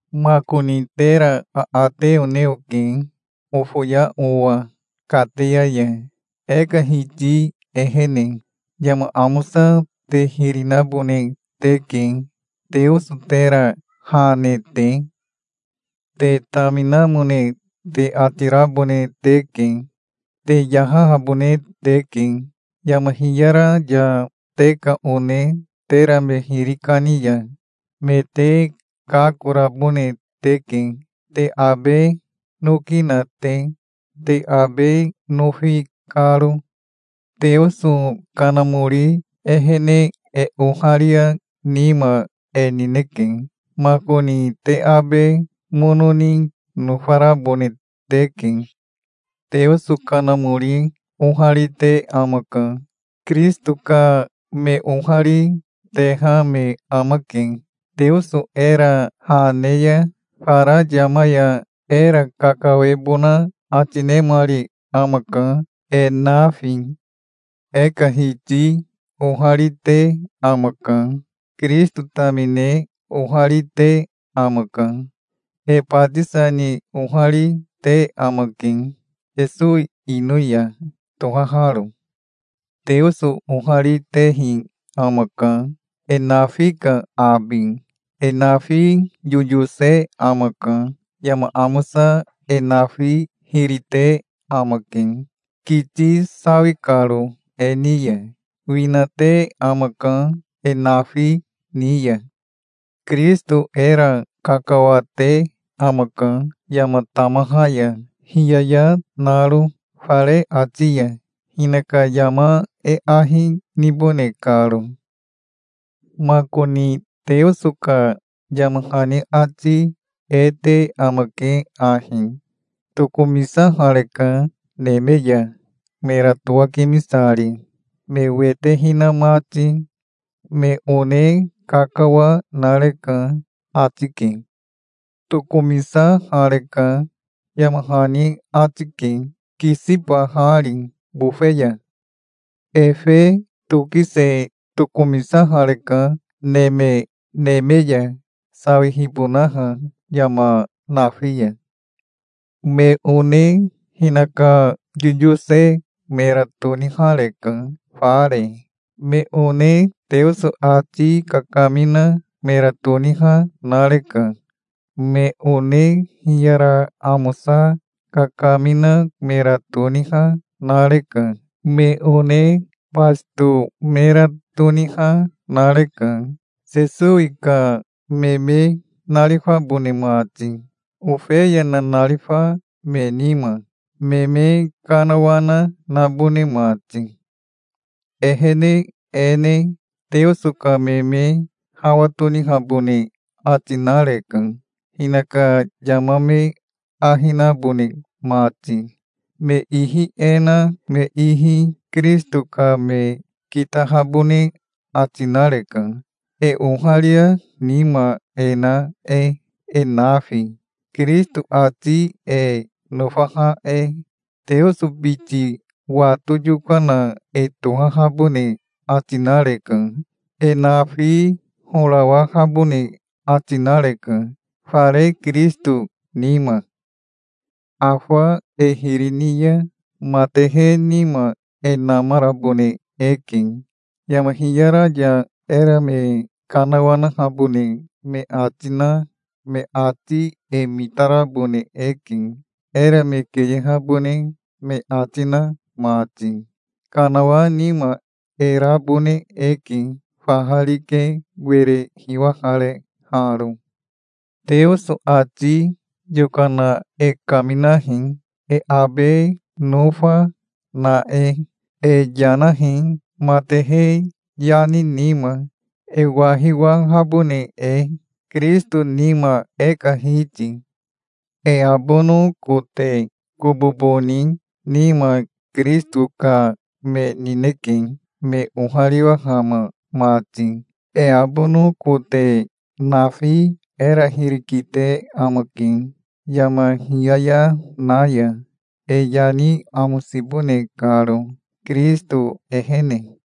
Makoni tera aate one oke, ofoya owa kateya ya, e ka Hiti ehene. Yama amosa te hiri nabone teke, Teoso tera ha ne te. Te taminamone te ati rabone teke. Te yahahabone teke. Yama hiyara ya te ka one tera me hiri kani ya me te kakorabone teke, te abe noki na te, te abe nofi karo. Teoso Kanamori ehene e oharia nima e nineke. Makoni te abe mono ni nofarabone teke. Teoso Kanamori oharite amaka. Kirisito ka me ohari, teha me amake. Teoso era ha ne ya fara yama ya era kakawebona ati nemari amaka, e nafi. E ka Hiti ohari, te amaka. Kirisito tamine ohari, te amaka. E batisa ni ohari, te amake, Sesowi ino ya tohaharo. Teoso ohari, tehi amaka, e nafi ka abi. E nafi yoyose amaka. Yama amosa e nafi hiri te amake, kiti sawi karo e ni ya. Wina, te amaka e nafi ni ya. Kirisito era kakawa, te amaka, yama tamaha ya hiyaya naro, fare ati ya, hinaka yama e ahi nibone karo. Makoni Teoso ka yama hani ati e te amake ahi: "Tokomisahareka neme ya, mera towakimisari, me wete hina mati. Me one kakawa nareka", ati ke. Tokomisahareka, yama hani ati ke, kisibahari bofe ya. Efe tokise tokomisahareka neme neme ya, sawihibonaha yama nafi ya. Me one hinaka yoyose mera tonihareka, fare. Me one Teoso ati kakamina mera toniha nareka. Me one hiyara amosa kakamina mera toniha, nareka. Me one basito mera toniha nareka, Sesowi ka me me narifabone mati, ofeya nanarifa me nima, me me kanawana nabone mati. Ehene e ne Teoso ka me me hawa tonihabone ati nareka, hinaka yama me ahi nabone mati. Me ihi e na me ihi Kirisito ka me kitahabone ati nareka, e oharia nima e na e, e nafi, Kirisito ati e nofaha e. Teoso biti wato yokana e tohahabone ati nareka. E nafi horawahabone ati nareka, fare Kirisito nima. Afa e hiri ni ya matehe nima e namarabone eke. Yama hiyara ya era me kanawanahabone me ati na me ati e mitarabone eke, era me keyehabone me ati na mati. Kanawa nima e rabone eke, faha rike were hiwahareharo. Teoso ati yokana e kaminahi, e abe nofa na e. E yanahi, matehe yani nima, e wahiwahabone e, Kirisito nima, e ka Hiti. E abono kote kobobo ni nima Kirisito ka me nineke, me ohariwahama mati. E abono kote nafi era hiri kite amake yama hiyaya na ya, e yani amosibone karo Kirisito ehene.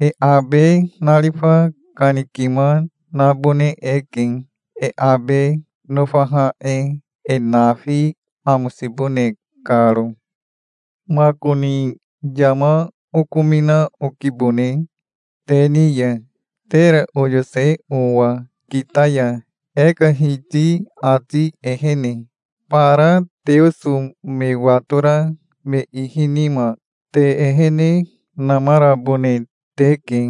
E abe narifa kanikima nabone eke, e abe nofaha e, e nafi amosibone karo. Makoni yama okomina okibone te ni ya, tera oyose owa kita ya, e ka Hiti ati ehene. Bara Teoso me watora me ihi nima te ehene namarabone teke,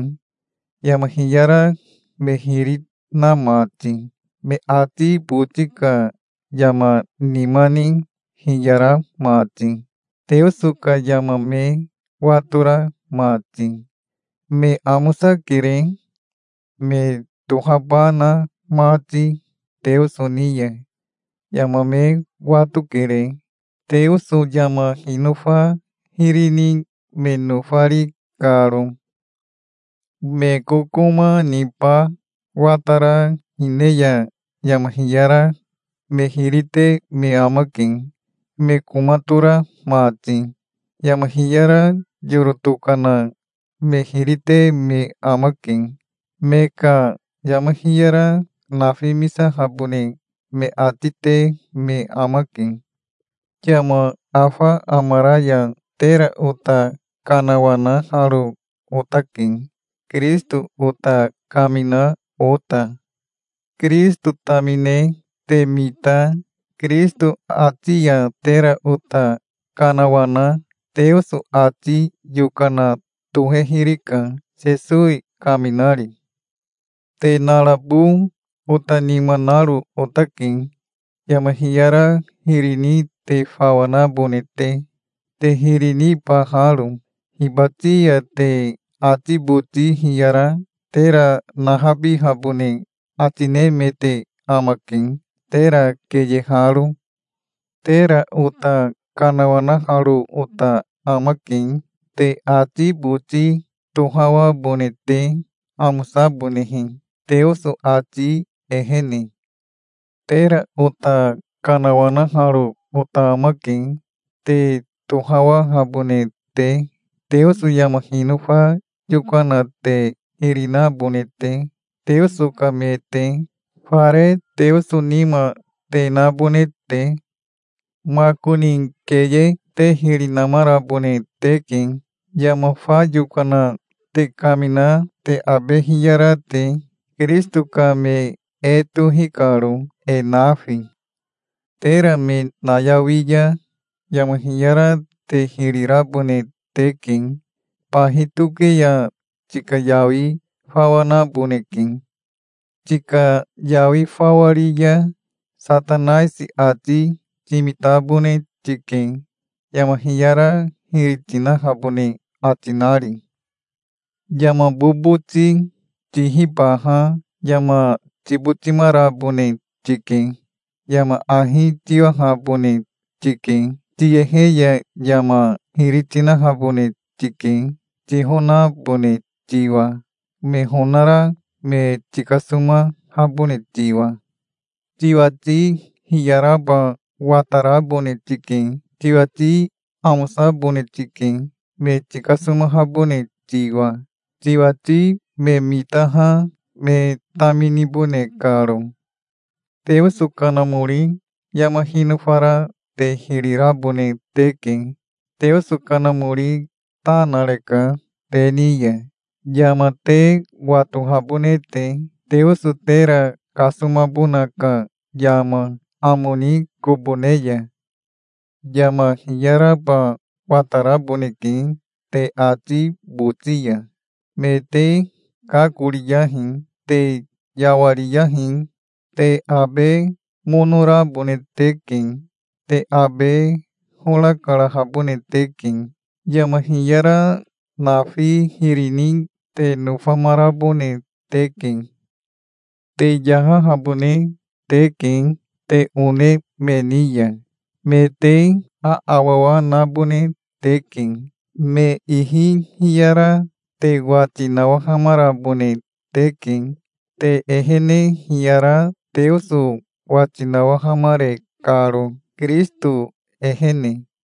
yama hiyara me hiri na mati, me ati boti ka yama nima ni hiyara mati, Teoso ka yama me watora mati. Me amosakere, me tohaba na mati Teoso ni ya. Yama me watokere, Teoso yama hinofa hiri ni me nofari karo. Me kokoma niba watara hine ya yama hiyara me hiri te me amake, me koma tora mati. Yama hiyara yoro tokana me hiri te me amake. Me ka yama hiyara nafimisahabone me ati te me amake. Yama afa amara ya tera ota kanawanaharo otake, Kirisito ota kamina ota. Kirisito tamine te mita Kirisito ati ya tera ota kanawana Teoso ati yokana tohehirika, Sesowi kaminari. Te narabo ota nima naro otake, yama hiyara hiri ni te fawa nabone te, te hiri nibaharo. Hibati ya te ati boti hiyara tera nahabihabone ati nemete amake, tera keyeharo. Tera ota kanawanaharo ota amake, te ati boti tohawabone te, amosabonehe, Teoso ati ehene. Tera ota kanawanaharo ota amake, te tohawahabone te, Teoso yama hinofa yokana te hiri nabone te, Teoso ka me te, fare Teoso nima te nabone te. Makoni keye te hiri namarabone teke, yama fa yokana te kamina te abe hiyara te, Kirisito ka me e tohi karo, e nafi. Tera me nayawi ya yama hiyara te hiri rabone teke. Bahi toke ya tika yawi fawa naboneke. Tika yawi fawa ri ya Satanaisi ati timitabone tike, yama hiyara hiri tinahabone ati nari. Yama boboti tihibaha yama tibotimarabone tike. Yama ahi tiwahabone tike. Tiyehe ya yama hiri tinahabone tike, tihonabone tiwa, me honara me tikasomahabone tiwa. Tiwati hiyaraba watarabone tike. Tiwati amosabone tike, me tikasomahabone tiwa, tiwati me mitaha me taminibone karo. Teoso Kanamori yama hinofara te hiri rabone teke. Teoso Kanamori ta nareka te ni ya, yama te watohabone te, Teoso tera kasomabona ka yama, amo ni kobo ne ya. Yama hiyaraba wataraboneke te ati boti ya. Me te kakoriyahi. Te yawariyahi. Te abe mono rabone teke. Te abe hora karahabone teke. Yama hiyara nafi hiri ni te nofamarabone teke. Te yahahabone teke te one me ni ya. Me te aawawa nabone teke. Me ihi hiyara te wati nawahamarabone teke, te ehene hiyara Teoso wati nawahamare karo, Kirisito ehene.